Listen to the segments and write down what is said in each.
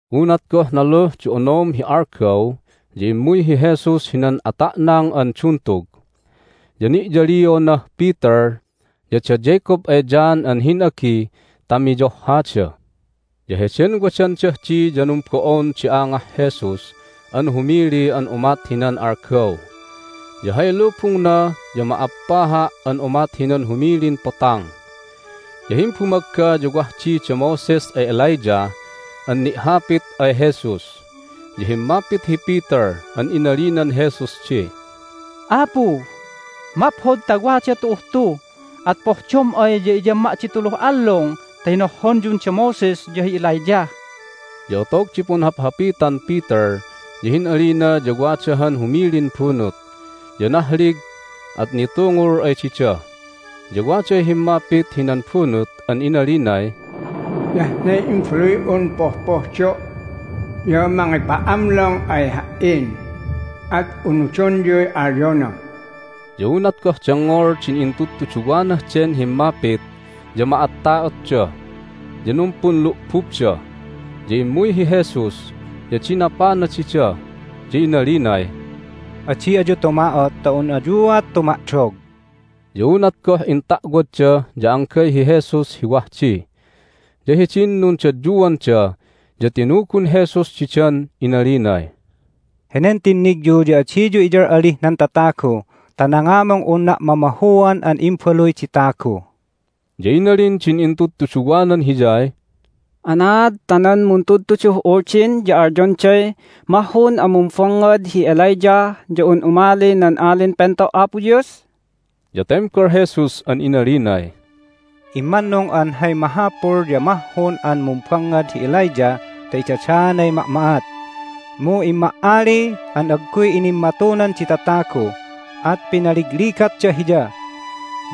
Unat goh naluh di onom hi algaw ya immuy hi Jesus hinan ata'nang an duntug. Ya ni'yalionah Peter, ya da Jacob ay John an hin'agi ta miyohhada. Ya heden wadandah di ya numbo'on di angah Jesus an humili an umat hinan algaw, ya hay lubungna ya ma'appaha' an umat hinan humilin potang. Ya himbumagga ya wah di da Moses ay Elijah an ni'hapit ay Jesus. Ya himmapit hi Peter an inalinan Jesus di, "Apu, maphod ta wada tu'uh tu! At pohdom ay ya iyamma' di tuluh allung ta hinohhonyun da Moses ya hi Elijah!" Ya otog di punhaphapitan Peter ya hin'alina ya wada han humilin bunut, ya nahlig, at nitungul ay dida. Ya waday himmapit hinan bunut an inalinay, "Hiyah ne Imbaluy'un pohpohdo' ya mangipa'amlong ay Ha"in, at unudonyuy alyona!" Ya unat goh dengngol din intudtuduwanah den himmapit ya ma'atta'otda, ya numpunlu'bubda. Ya immuy hi Jesus, ya dinapana dida, ya inalinay, "Adi ayu tuma'ot ta un ayuat tuma'dog!" Ya unat goh inta'wadda ya anggay hi Jesus hi wah di. Ya hidin nundadyuanda ya tinugun Jesus didan inalinay, "Henen tinnigyu ya adiyu iyal'alih nan tatagu ta nangamung unna' mamahuan an Imbaluy di Tagu." Ya inalin din intudtuduwanan Hiyay, "Anaad ta nan muntudtuduh Uldin ya alyonday mahhun an mumbangngad hi Elijah ya un umali nan Alin Pento' Apo Dios?" Ya tembal Jesus an inalinay, "Immannung an hay mahapul ya mahhun an mumbangngad hi Elijah ta idadaanay ma'ma'at. Mu imma'ali an agguy inimmatunan di tatagu, at pinaligligatda hiya.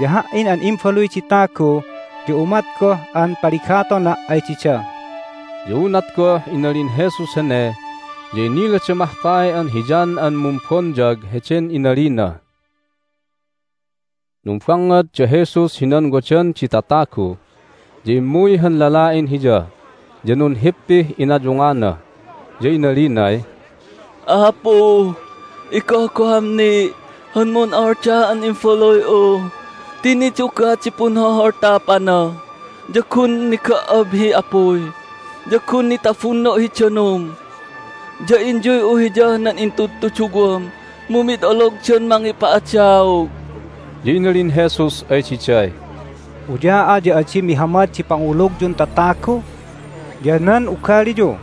Ya Ha"in an Imbaluy di Tagu ya umat goh an paligatona' ay dida." Ya unat goh inalin Jesus hene ya inilada mahkay an hi John an Mumbonyag heden inalina. Numbangngad da Jesus hinan wadan di tatagu, ya immuy han lala'in Hiya, ya nunhippih inayungana, ya inalinay, "Apu, igohgoham ni' han mun'oldah an imbaluy'u ti nidugah di punholholtapana! Ya gun niga"ab hi apuy, ya gun nitabunno' hi danum! Ya inyuy'u hiyah nan intudtuduwam, mu mid ologdan mangipa'adaog." Ya inalin Jesus ay diday, "Uya'a ya adi mihamad di pangulugyun tatagu ya nan ugaliyu,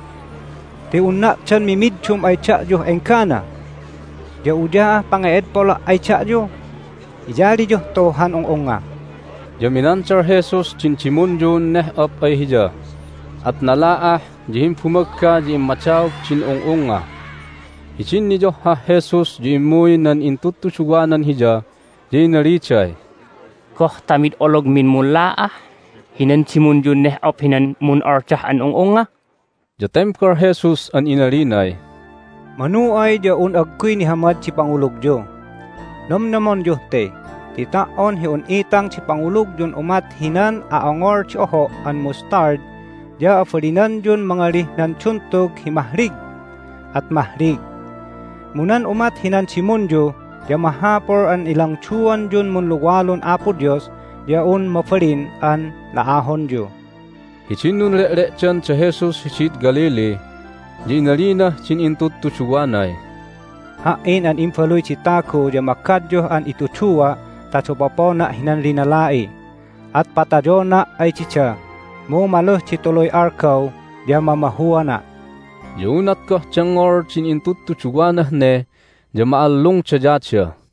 ti unna' dan mimiddum ay da'yuh enggana? Ya uya'ah pange'edpola' ay da'yu? Iyaliyuh tu han ung'ungnga!" Ya minandal Jesus din dimunyun neh'op ay hiya, at nala'ah, ya himbumagga ya immadaog din ung'ungnga. Hidin niyohhah Jesus ya immuy nan intudtuduwanan Hiya, ya inaliday, "Goh ta mid ologmin munla'ah hinan dimunyun neh'op hinan mun'oldah an ung'ungnga?" Ya tembal Jesus an inalinay, "Manu ay ya un agguy nihamad di pangulugyu. Nomnomonyuh te, ti ta"on hi un itang di pangulugyun umat hinan a'ongol di oho' an mustard ya abalinanyun mangalih nan duntug hi mahlig, at mahlig. Mu nan umat hinan dimunyu ya mahapul an ilangduanyun munluwalun Apo Dios ya un mabalin an la'ahonyu." Hidin nunle'le'dan da Jesus hidid Galilee ya inalinah din intudtuduwanay, "Ha"in an Imbaluy di Tagu ya magadyuh an itudua' ta dapopona' hinan linala'i. At patayona' ay dida, mu maluh di tuluy algaw ya mamahuana'." Ya unat goh dengngol din intudtuduwanah ne ya ma'allungdayada.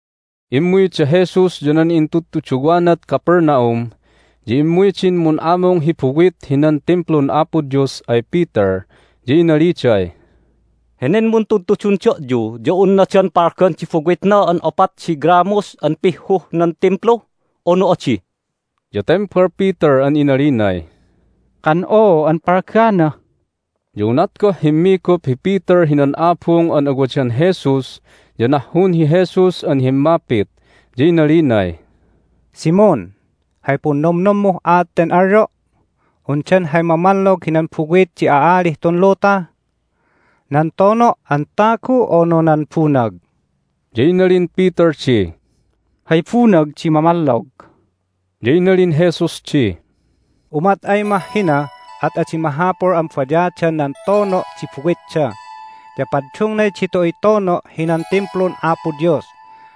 Immuy da Jesus ya nan intudtuduwanad Capernaum. Ya immuy din mun'amung hi buwit hinan Timplun Apo Dios ay Peter, ya inaliday, "Henen muntudtudun da'yu ya unna dan palgan di buwitna an opat di gramos an pihhuh nan Timplu, unu adi?" Ya tembal Peter an inalinay, "Kan oo an palgana." Ya unat goh himmigup hi Peter hinan abung an awadan Jesus ya nahhun hi Jesus an himmapit, ya inalinay, "Simon, hay punnomnommuh aat ten alyo'? Undan hay mamallog hinan buwit di a'alih tun luta? Nan tono' an tagu, unu nan bunag?" Ya inalin Peter di, "Hay bunag di mamallog." Ya inalin Jesus di, "Umat ay mah hina at adi mahapul an bayadan nan tono' di buwitda, ya paddungnay ditu'uy tono' hinan Timplun Apo Dios,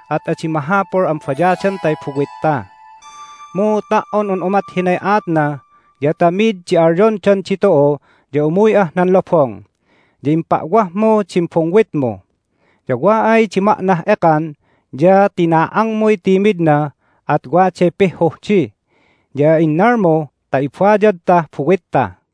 at adi mahapul an bayadantay buwitta. Mu ta"on un umat hinay aatna ya ta mid di alyondan ditu'u ya umuy'ah nan lobong, ya impa'wahmu din bungwitmu. Ya wa ay di ma'nah ekan ya tina'angmuy timidna, at waday pihhuh di. Ya innalmu ta ibayadtah buwitta."